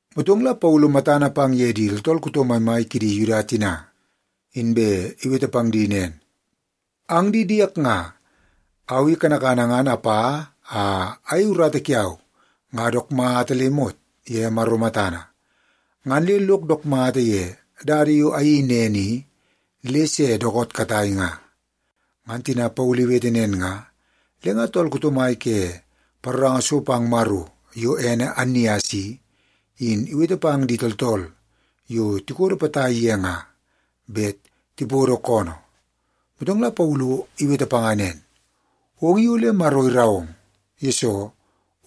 Motong la Paulu matana pang ye di tooltool kuto maimai kidi Yuda tina, inbe iwete pang di nen, “Ang di diek nga, au i kanakana ngan apa a ayei urata kiau nga dook mata le imot ye Maro matana, ngan le lok dook mata ye dada yo ayeii nen i le se dookoot katai nga.” Ngan tina Paulu iwete nen nga, le nga tool kuto mai ke paroranga so pang Maro yo ene Annias i, in iwete pang di tooltool yo tikodo potai ye nga bet tipodo koonoo. Motong la Paulu iwete panga nen, “Ong in ole Maro irau ong, yesoo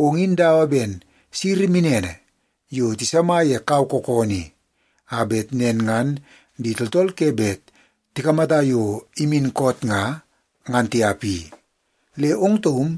ong in dawa ben siri minene yo tisama ye kau kookoonoo i, a bet nen ngan di tooltool ke bet tikamata yo imin koot nga, ngan tiap i. Le ong taum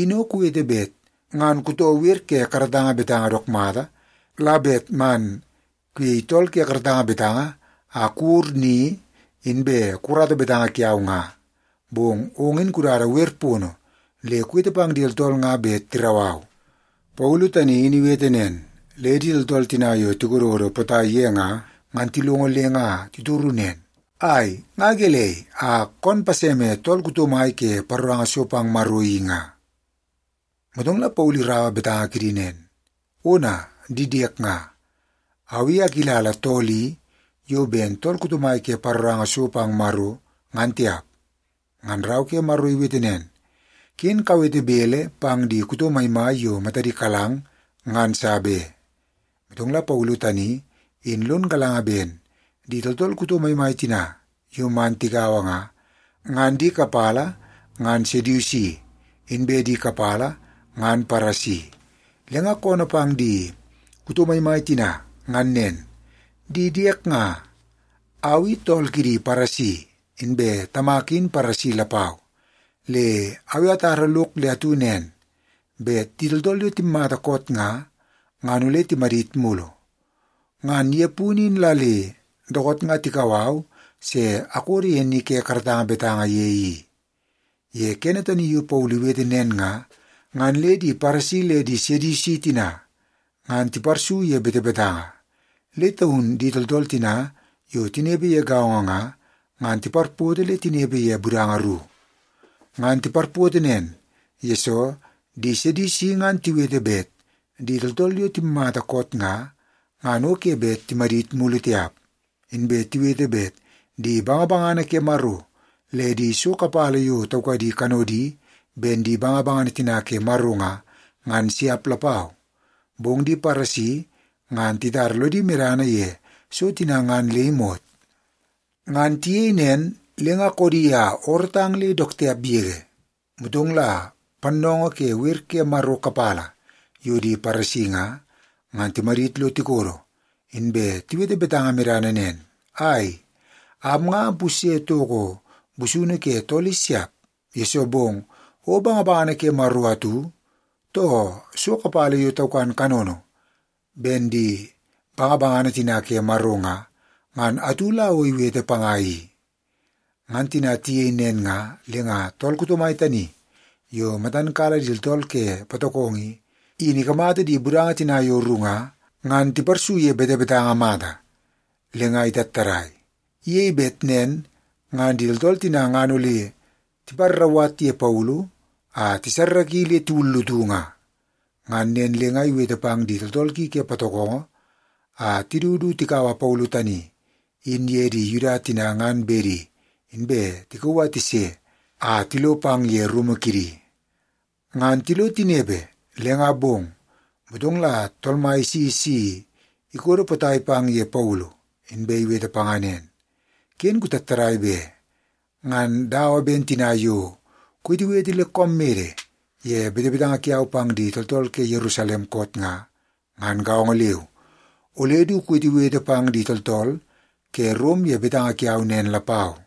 in o kuwete bet ngan kutoo wer ke karatanga betanga dook mata, la bet man kuyei tool ke karatanga betanga a kuwur ni inbe kukarata betanga kiau nga, bong ong in kudada wer pono le kuwete pang di tooltool nga bet tirau au.” Paulu tani in iwete nen, le di tooltool tina yo tikododo potai ye nga, ngan tilongo le nga titoru nen, “Ai, nga gelei a kon paseme tool kuto mai ke paroranga so pang Maro i nga?” Motong la Paulu iraua betanga kidi nen, “Ona, di diek nga, au i akilala tool i yo ben tool kuto mai ke paroranga so pang Maro, ngan tiap. Ngan Rau ke Maro iwete nen, ‘Ken kawete bele pang di kuto maimai yo matadi kalang, ngan sa be.’” Motong la Paulu tani in lon galanga ben di tooltool kuto maimai tina yo man tigaua nga, ngan di kapala ngan Sedusi, inbe di kapala ngan Paresi. Le nga koonoo pang di kuto maimai tina ngan nen, “Di diek nga, au i tool kidi Paresi, inbe tamak in Paresi lapau. Le au i atar lok le atu nen, bet di tooltool yo timmata koot nga, ngan ole timadit mulu. Ngan ye punu in la le dookoot nga tikau au se akodo ye ni ke karatanga betanga ye i.” Ye kene tani yo Paulu iwete nen nga, ngan le di Paresi le di Sedusi tina ngan tiparsu ye betebetanga, le taun di tooltool tina yo tinepe ye gaongo nga, ngan tiparpoto le tinepe ye budanga ru. (Ngan tiparpoto nen, yesoo di Sedusi ngan tiwete bet di tooltool yo timmata koot nga, ngan o ke bet timadit mulu tiap. Inbe tiwete bet di bangabangana ke Maro le di so kapala yo taukadi kanodi ben di bangabangana tina ke Maro nga, ngan siap lapau. Bong di Paresi ngan titara lodi medana ye so tina ngan le imot.) Ngan tiyei nen, le nga koodi a oorootang le dook tiap yege. Motong la pannoongoo ke wer ke Maro kapala yo di Paresi nga, ngan timadit lo tikodo, inbe tiwete betanga medana nen, “Ai, am nga ampusye toko busunu ke tool i siap, yesoo bong o bangabangana ke Maro atu, too so kapala yo taukan kanono ben di bangabangana tina ke Maro nga, ngan atu la o iwete panga i.” Ngan tina tiyei nen nga, le nga tool kuto mai tani yo matan kala di tooltool ke patokongo i, in ikamata di budanga tina yo ru nga, ngan tiparsu ye betebetanga mata, le nga itattadai. Iyei bet nen ngan di tooltool tina ngan ole tiparrauwat ye Paulu a tisarraki le tiwullutu nga. Ngan nen le nga iwete pang di tooltool ki ke patokongo a tidu du tikaua Paulu tani in ye di Yuda tina ngan bedi, inbe tikauu a tise a tilo pang ye rumu kidi. Ngan tilo tinepe, le nga bong, motong la Tool Mai isi si ikodo potai pang ye Paulu, inbe iwete panga nen, “Ken kutattadai be! Ngan dawa ben tina yo kuwetewete le koom mede ye betanga kiau pang di tooltool ke Yerusalem koot nga, ngan gaongo leu, ole du kuwetewete pang di tooltool ke Rom ye betanga kiau nen lapau.”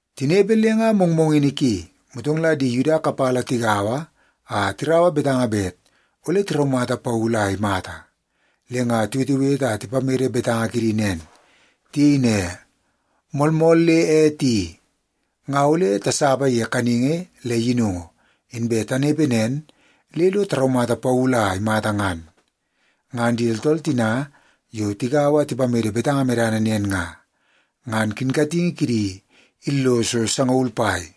Tinepe le nga mongmongini ki, motong la di Yuda kapala tigaua a tiraua betanga bet ole tiraumata Paulu a imata. Le nga tiwetewete a tipamede betanga kidi nen. Tiyei ne, “Moolmool le ete i, nga ole tasapa ye kaningi le yinungu, inbe tanepe nen le lo taraumata Paulu a imata ngan.” Ngan di tooltool tina yo tigaua a tipamede betanga medana nen nga, ngan kinkatingi kidi illoso sangaul pai.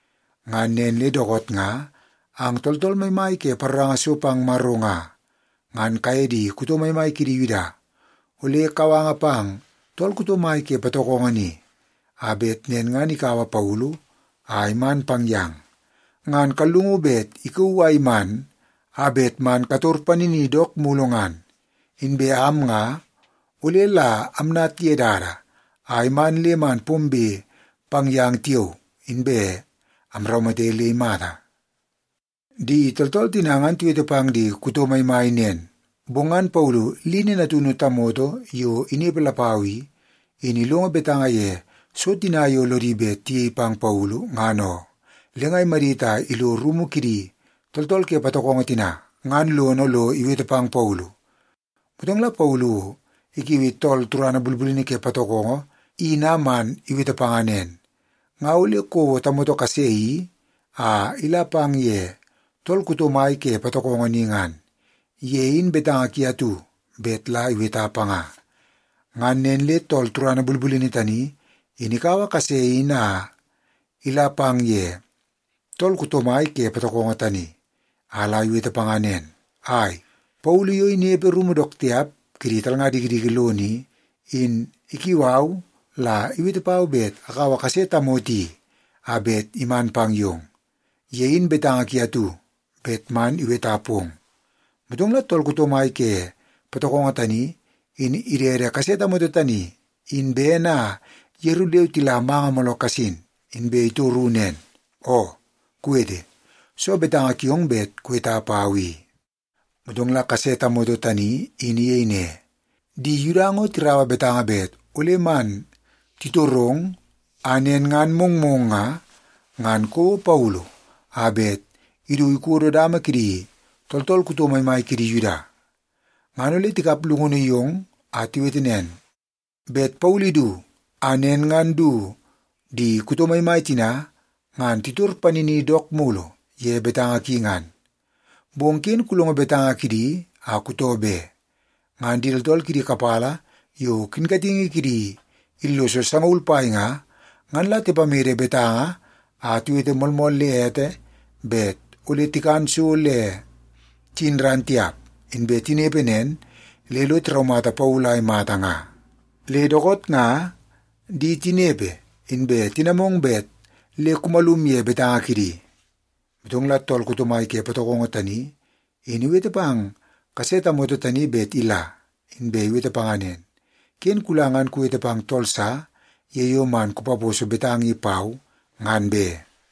Ngan nen le dookoot nga, ang tooltool maimai ke paroranga so pang Maro nga, ngan kaye di kuto maimai kidi Yuda ole kawanga pang tool kuto mai ke patokongo ni, a bet nen ngan ikaua Paulu a iman pang yang. Ngan kallungu bet ikauu a iman a bet man kator panini dook mulu ngan. Inbe am nga ole la amnat ye dada a iman le man pombe pang yang tiao, inbe amraumate le imata.” Di tooltool tina ngan tiwete pang di kuto maimai nen, bong ngan Paulu lini natunu tamoto yo inepe lapau i, in ilongo betanga ye so tina yo lodi bet tiyei pang Paulu, ngan oo. Le nga imadit a ilo rumu kidi tooltool ke patokongo tina ngan lono lo iwete pang Paulu. Motong la Paulu ikiui tool turana bulbulini ke patokongo in a man iwete panga nen, “Nga ole kouo tamoto kase i a ila pang ye tool kuto mai ke patokongo ni ngan. Ye in betanga ki atu bet la iweta panga.” Ngan nen le tool turana bulbulini tani, in ikaua kase in a ila pang ye tool kuto mai ke patokongo tani, a la iwete panga nen, “Ai, Paulu yo inepe rumu dook tiap kidi talnga dikidiki lono i, in ikiu au la iwete pau bet akaua kase tamoto i a bet iman pang yong. Ye in betanga ki atu bet man iweta pong.” Motong la tool kuto mai ke patokongo tani, in idede kase tamoto tani in bene a yeru leu tila manga mooloo kasin, inbe itoru nen, “Oo, kuwete. Soo betanga kiong bet kuweta pau i?” Motong la kase tamoto tani in iyei ne, “Di Yuda ngo tiraua betanga bet ole man titorong a nen ngan mongmong nga, ngan kouo Paulu a bet idu ikodo dama kidi tooltool kuto maimai kidi Yuda. Ngan ole tikap llungunu yong a tiwete nen, bet Paulu idu a nen ngan du di kuto maimai tina ngan titor panini dook mulu ye betanga ki ngan. Bong ken kulongo betanga kidi a kutoo be. Ngan di tooltool kidi kapala yo kinkatingi kidi illoso sangaul pai nga, ngan la tipamede betanga a tiwete moolmool le ete, bet ole tikan so le tiyin ran tiap, inbe tinepe nen le lo tiraumata Paulu a imata nga. Le dookoot nga di tinepe inbe tinamong bet le kumalum ye betanga kidi.” Motong la tool kuto mai ke patokongo tani in iwete pang kase tamoto tani bet ila, inbe iwete panga nen, “Ken kula ngan kuwete pang tool sa ye yo man kupaposo betanga i pau, ngan be.”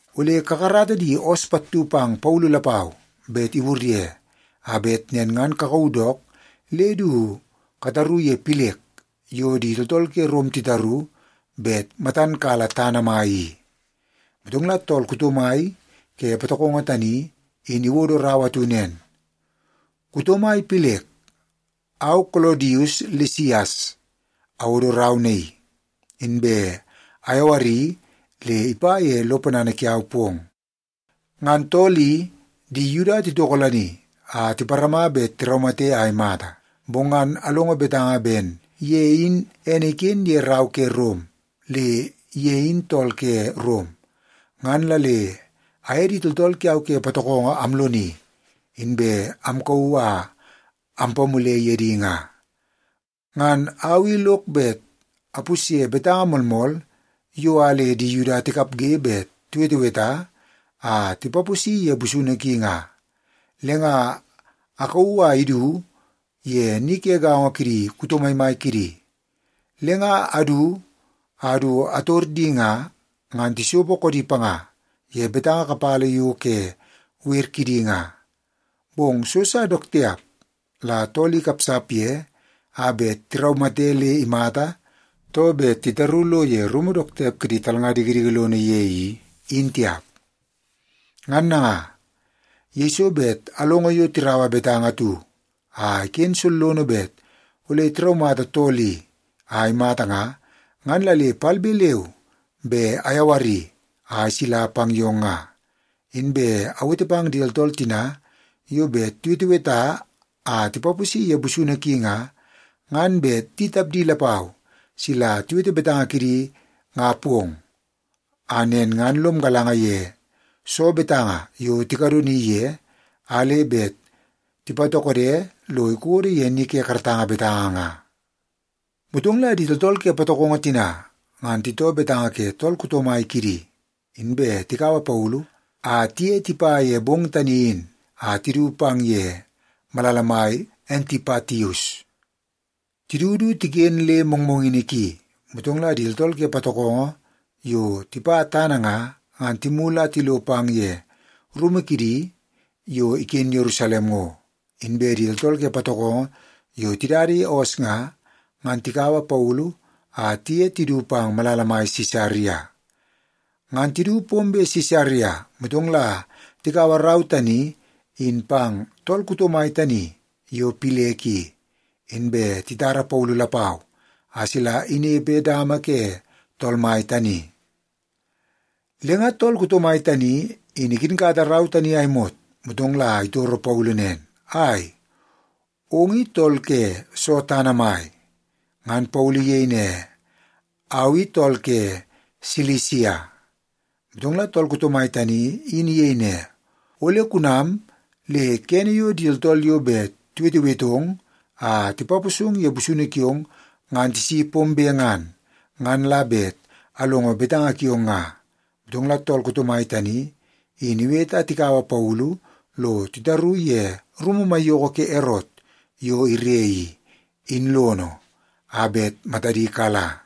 Ole kakarata di oos pattu pang Paulu lapau bet iwur ye, a bet nen ngan kakauu dook le du kataru ye Pilek yo di tooltool ke Rom titaru bet matan kala tana mai i.” Motong la tool kuto mai ke patokongo tani in iwodo rau atu nen, Kuto mai Pilek, au Kolodius Lisias awodo rau naii, inbe ayawari le ipa ye lo ponana kiau pong. Ngan tool i, di Yuda titokolani a tiparama bet tiraumate a imata. Bong ngan alongo betanga ben ye in ene iken ye rau ke Rom le ye in tool ke Rom, ngan la le aye di tooltool kiau ke patokongo amloni, inbe amkauu a ampamule ye di nga. Ngan au i lok bet apusye betanga moolmool yo a le di Yuda tikapge bet tiweteweta a tipaposi ye busunu ki nga, le nga akauu a idu ye ni ke gaongo kidi kuto maimai kidi. Le nga adu a du ator di nga, ngan tisopo koodi panga ye betanga kapala yo ke wer kidi nga. Bong so sa dook tiap la tool i ikapsap ye a bet taraumate le imata, too bet tataru lo ye rumu dook tiap kidi talnga dikidiki lono ye i, in tiap. Ngan nanga, yeiso bet alongo yo tiraua betanga atu a iken sollono bet ole tiraumata tool i a imata nga, ngan la le palbe leu be ayawari a isila pang yong nga. Inbe awete pang di tooltool tina yo bet tiweteweta a tipaposi ye busunu ki nga, ngan bet di tapdi lapau sila tiwete betanga kidi nga pong, a nen ngan lom galanga ye soo betanga yo tikadoni ye, a le bet tipatokode lo ikodo ye ni ke karatanga betanga nga. Motong la di tooltool ke patokongo tina ngan titoo betanga ke tool kuto mai kidi, inbe tikaua Paulu a tiye tipa ye bong tani in a tidu pang ye malala mai Antipatius. Tidu du tiken le mongmongini ki, motong la di tooltool ke patokongo yo tipa tana nga, ngan timulu a tilo pang ye rumu kidi yo iken Yerusalem ngo. Inbe di tooltool ke patokongo yo tidada ye oos nga, ngan tikaua Paulu a tiye tidu pang malala mai Sisaria. Ngan tidu pombe Sisaria, motong la tikaua rau tani in pang tool kuto mai tani yo Pilek i, inbe titara Paulu lapau a sila inepe dama ke tool mai tani. Le nga tool kuto mai tani in ikinkata rau tani a imot, motong la itoro Paulu nen, “Ai, ong i tool ke soo tana mai?” Ngan Paulu iyei ne, “Au i tool ke Silisia.” Motong la tool kuto mai tani in iyei ne, “Ole kunam le kene yo di tooltool yo bet tiwetewetong a tipaposong ye busunu kiong ngan tisi pombe ngan, ngan la bet alongo betanga kiong nga.” Motong la tool kuto mai tani in iwete a tikaua Paulu lo titaru ye rumu maiyoko ke Erot yo ire i, in lono, a bet matadi kala.